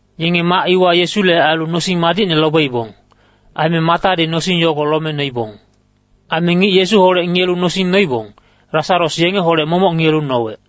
Yenge mac iwa Yesule ailu nosing madicne lobeibong. Aime Matadi nosing yogo lome noibong. Aime ngic Yesuholec ngiyelu nosing noibong, Lasaros yengeholec momoc ngiyelu nowec.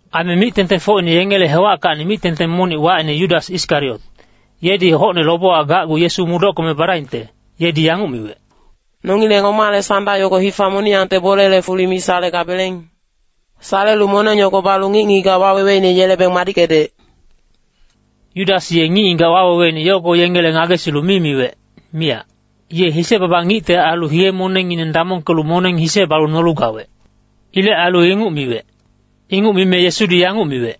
Aime mic-tengtengfocine yengele hewackacni mic-tengteng monic wacine Yudas Iskariot, yedi hocne lobewa gacgu Yesu mudockeme badaingte, yedi yanguc miwec, “Nongileng omale sanda yogo hifa moniyangte bolele fuli mi salegabeleng? Salelu moneng yogo balu ngic-ngigac waweweine yelebeng madickedec.” Yudas ye ngic-ngigac waweweine yogo yengele ngagesilu mi miwec, miyac. Ye hise-baba ngicte ailu hiye-monengngineng damongkelu moneng hise balu nolu gawec. Ilec ailu inguc miwec. Inguc mime Yesudi yanguc miwec,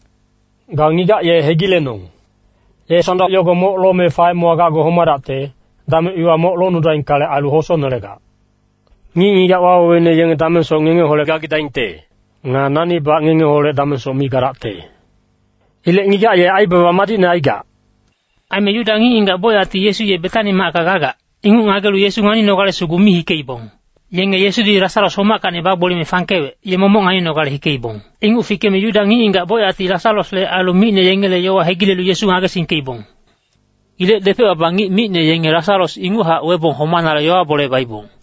“Ga ngigac ye hegilenong. Ye sanda yogo moc lome faemewa gacgu homadacte, dameng iwa moc longnudaingkale ailu, hosonelegac. Ngic-ngigac waweweine yenge damengsoc ngengeholec gagidaingte. Nga nanibac ngengeholec damengsoc mi gadacte. Ilec ngigac ye aibaba madicne aigac.” Aime Yuda ngic-ngigac bocyacti Yesu ye Betani macka gagac, inguc ngagelu Yesu nganinogale sugu mi hikeibong. Yenge Yesudi Lasaros homackacni bagboliyeme fangkewec, ye momoc nganinogale hikeibong. Inguc fikeme Yuda ngic-ngigac bocyacti Lasarosle ailu micne yengele yowa hegilelu Yesu ngagesingkeibong. Ilec depec-baba ngic micne yenge Lasaros inguchac webong homanale yowa-bole baibong.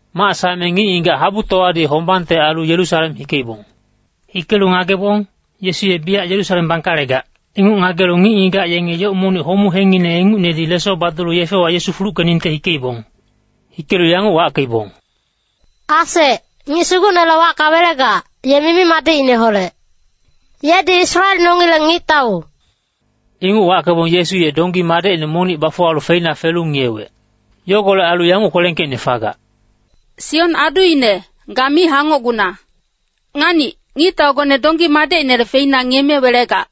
Mac saeme ngic-ngigac habutowadi hombangte ailu Yerusalem hikeibong. Hikelu ngagebong, Yesu ye biyac Yerusalem bangkalegac, inguc ngagelu ngic-ngigac yenge yoc monic homu hengngine ingucnedi leso badulu yefewa Yesu fuluckeningte hikeibong. Hikelu yanguc wackeibong, “Asec, ngic Sugucnele wacka welegac, ye mimi-madicineholec. Yedi Israel nongileng Ngictau.” Inguc wackebong Yesu ye donggi madecine monic bafuwalu feina felu ngiyewec. Yogolec ailu yanguc kwelengkeicne fagac, “Sion aduine, ga mi hangocguna. Nganic, ngictaugone donggi madecinele feina ngiyeme welegac.”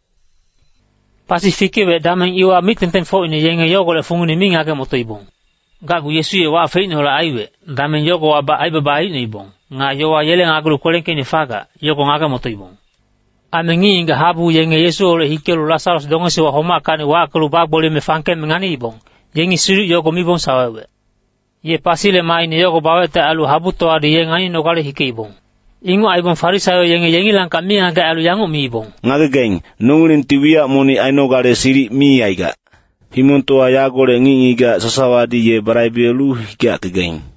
Pasi fikewec dameng iwa mic-tengtengfocine yenge yogolec fungine mi ngage-motoibong. Gacgu Yesu ye wac feicneholec aiwec, dameng yogowabac aibaba aicnoibong. Nga yowa yele ngagelu kwelengkeicne fagac, yogo ngage-motoibong. Aime ngic-ngigac habu yenge Yesuholec hikelu Lasaros dongesiwa homackacni wackelu bagboliyeme fangkeme nganiibong, yengi siduc yogo mibong sawewec. Ye pasile maaine yogo bawecte ailu habutowadi ye nganinogale hikeibong. Inguc aibong Farisaio yenge yengilangkac mingagec ailu yanguc miibong, “Ngagegaing, nongilengti wiyac monic ainogale silic mi aigac. Himongtowa yagolec ngic-ngigac sasawadi ye balaibelu hikeyackegaing.”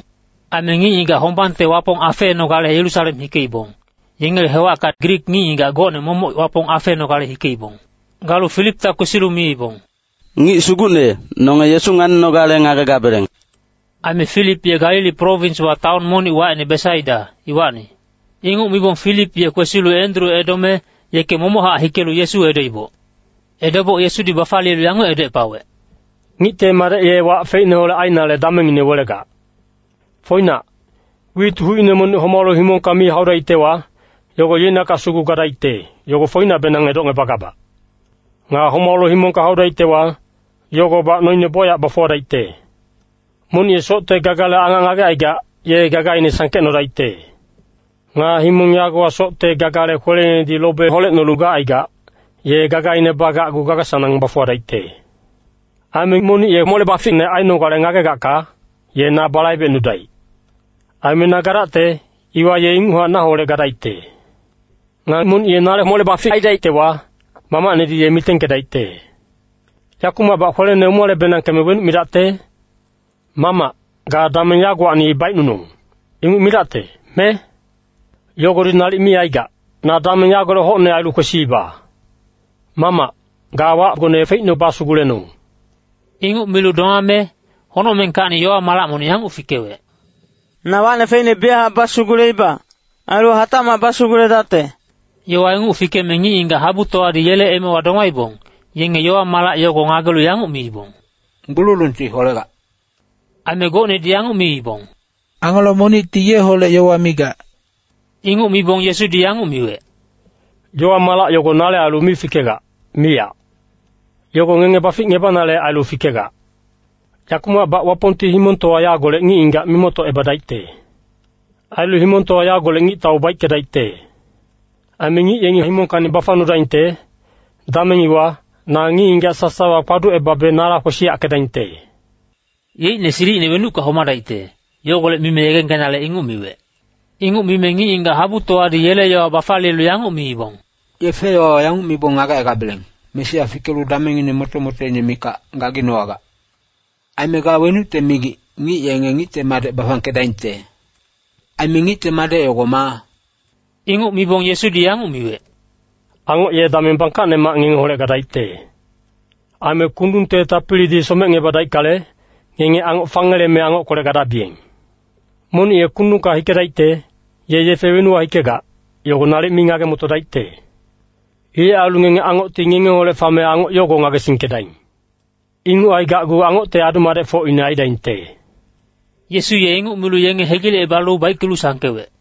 Aime ngic-ngigac hombangte Wapong afeenogale Yerusalem hikeibong, yengele hewacka Grik ngic-ngigac gocne momoc Wapong afeenogale hikeibong. Galu Filipta kwesilu miibong, “Ngic sugucne, nonge Yesu nganinogale ngagegabeleng.” Aime Filip ye Galili prowinswa taon monic wacine Besaida, iwacni. Inguc mibong Filip ye kwesilu Endru edome, yeke momochac hikelu Yesu edoiboc. Edoboc Yesudi bafaliyelu yanguc edocepawec, “Ngicte Madec ye wac feicneholec ainale damengngine welegac. Foinac, wit hucine monic homalu himongka mi haudaictewa, yogo yeicnakac sugu gadaicte, yogo foinacbenang edocngebagabac. Nga homalu himongka haudaictewa, yogobac noine bocyac bafuwadaicte. Monic ye socte gagale angac ngagecaigac, ye gagaine sangkecnodaicte. Nga himong yagowa socte gagale kweleinedi lobe holecnolu gacaigac, ye gagaine bagacgu gaga-sanang bafuwadaicte. Aime monic ye mole-baficne ainogale ngagegacka, ye na balaibecnudaic. Aime na gadacte, iwa ye inguchac naholec gadaicte. Nga monic ye nale mole-bafic aidaictewa, Mamacnedi ye mitengkedaicte. “Yakumacbac kwelene umale-benangkeme wenuc midacte? Mamac, ga dameng yagowacni baicnunong, inguc midacte, me? Yogodi nalic mi aigac, na dameng yagolec hocne ailu kwesiiba. Mamac, ga wacgone feicne basugulenong.” Inguc milu domame, honocmengkacni yowa-malac monic yanguc fikewec, “Na wacne feicne biyachac basuguleiba, ailu hatacmac basuguledacte.” Yowa inguc fikeme ngic-ngigac habutowadi yele emewa domaibong, yenge yowa-malac yogo ngagelu yanguc miibong, “Gbululungti holegac.” Aime gocnedi yanguc miibong, “Angelo monicti yeholec yowa migac.” Inguc mibong Yesudi yanguc miwec, “Yowa-malac yogo nale ailu mi fikegac, miyac. Yogo ngenge baficngebanale ailu fikegac. Yakumacbac Wapongti himongtowa yagolec ngic-ngigac mimoctocebadaicte. Ailu himongtowa yagolec ngictau baickedaicte. Aime ngic yengi himongkacni bafangnudaingte, dameng iwa, na ngic-ngigac sasawa kpaducebabe nala kwesiyackedaingte.” Yeicne silicine wenucka homadaicte, yogolec mime yegengkenale inguc miwec. Inguc mime ngic-ngigac habutowadi yele yowa bafaliyelu yanguc miibong, “Yefe-yowawa yanguc mibong ngagecaigabeleng, ‘Mesia fikelu damengngine moto-motoine mikac gaginowagac.’ Aime ga wenucte migic, ‘Ngic yenge Ngicte Madec bafangkedaingte.’ Aime Ngicte Madec yogo maa?” Inguc mibong Yesudi yanguc miwec, “Angoc ye dameng bangkacnemac ngengeholec gadaicte. Aime kundungte tapilidi somecngebadaickale, ngenge angoc fangeleme angockolec gadabiyeng. Monic ye kundungka hikedaicte, ye yefe wenuwa hikegac, yogo nalic mi ngage-motodaicte. Ilec ailu ngenge angocti ngengeholec fame angoc yogo ngagesingkedaing. Inguc aigacgu angocte adu-madecfocine aidaingte.” Yesu ye inguc milu yenge hegilecebalu baickelu sangkewec.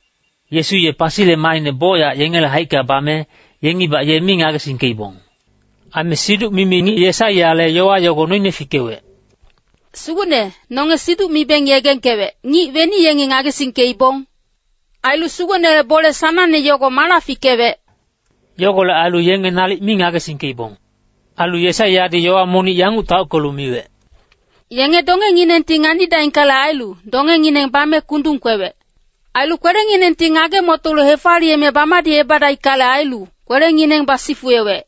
Yesu ye pasile maaine bocyac yengele haicka bame, yengibac ye mi ngagesingkeibong. Aime siduc-mimi ngic Yesaiyale yowa yogo noine fikewec, “Sugucne, nonge siduc mibeng yegengkewec, ngic weni yengi ngagesingkeibong? Ailu Sugucnele bole sanangne yogo mala fikewec?” Yogolec ailu yenge nalic mi ngagesingkeibong. Ailu Yesaiyadi yowa monic yanguc taockelu miwec, “Yenge dongenginengti nganidaingkale ailu, dongengineng bame kundung kwewec. Ailu kwelenginengti ngage-motolu hefaliyeme bamadicebadaickale ailu, kwelengineng basifuwewec.”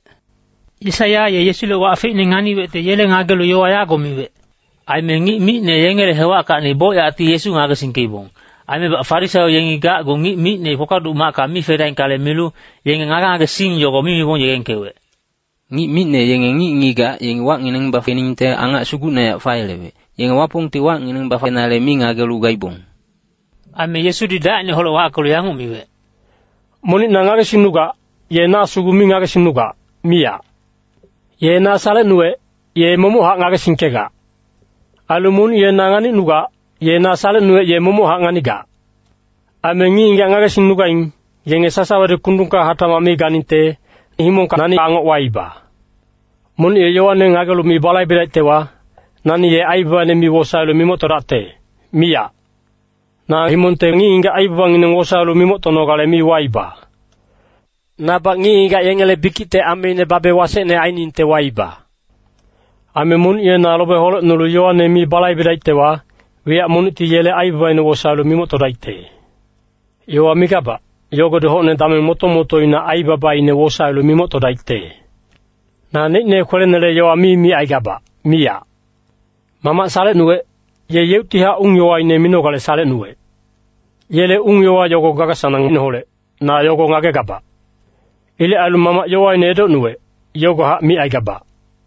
Yesaiya ye Yesule wac feicne nganiwecte yele ngagelu yowa yago miwec. Aime ngic micne yengele hewackacni bocyacti Yesu ngagesingkeibong. Aimebac Farisaio yengi gacgu ngic micne kpakpaduc macka mi fedaingkale milu, yenge ngage-ngagesing yogo mi mibong yegengkewec. Ngic micne yenge ngic-ngigac yengi wacngineng bafeningte angac sugucnehac fayelewec, yenge Wapongti wacngineng bafenale mi ngagelu gaibong. Aime Yesudi dacineholec wackelu yanguc miwec, “Monic na ngagesingnugac, ye na sugu mi ngagesingnugac, miyac. Ye na salecnuwec, ye momochac ngagesingkegac. Ailu monic ye na nganicnugac, ye na salecnuwec ye momochac nganigac. Aime ngic-ngigac ngagesingnugaing, yenge sasawadi kundungka hatacmac mi ganingte, himongka nani angoc waiba. “Monic ye yowane ngagelu mi balaibedaictewa, nani ye aibabaine mi wosaelu mimoctodacte, miyac. Na himongte ngic-ngigac aibabangineng wosaelu mimoctonogale mi waiba. Nabac ngic-ngigac yengele bikicte ameine babe wasecne ainingte waiba. Aime monic ye na lobe holecnulu yowane mi balaibedaictewa, wiyac monicti yele aibabaine wosaelu mimoctodaicte. Yowa migabac, yogodi hocne dameng moto-motoina aibabaine wosaelu mimoctodaicte. Naneicne kwelenele yowa mi micaigabac, miyac. Mamac salecnuwec, ye yeuctihac ung-yowaine minogale salecnuwec. Yele ung-yowa yogo gaga-sanangineholec, na yogo ngagegabac. Ilec ailu Mamac yowaine edocnuwec, yogohac micaigabac.”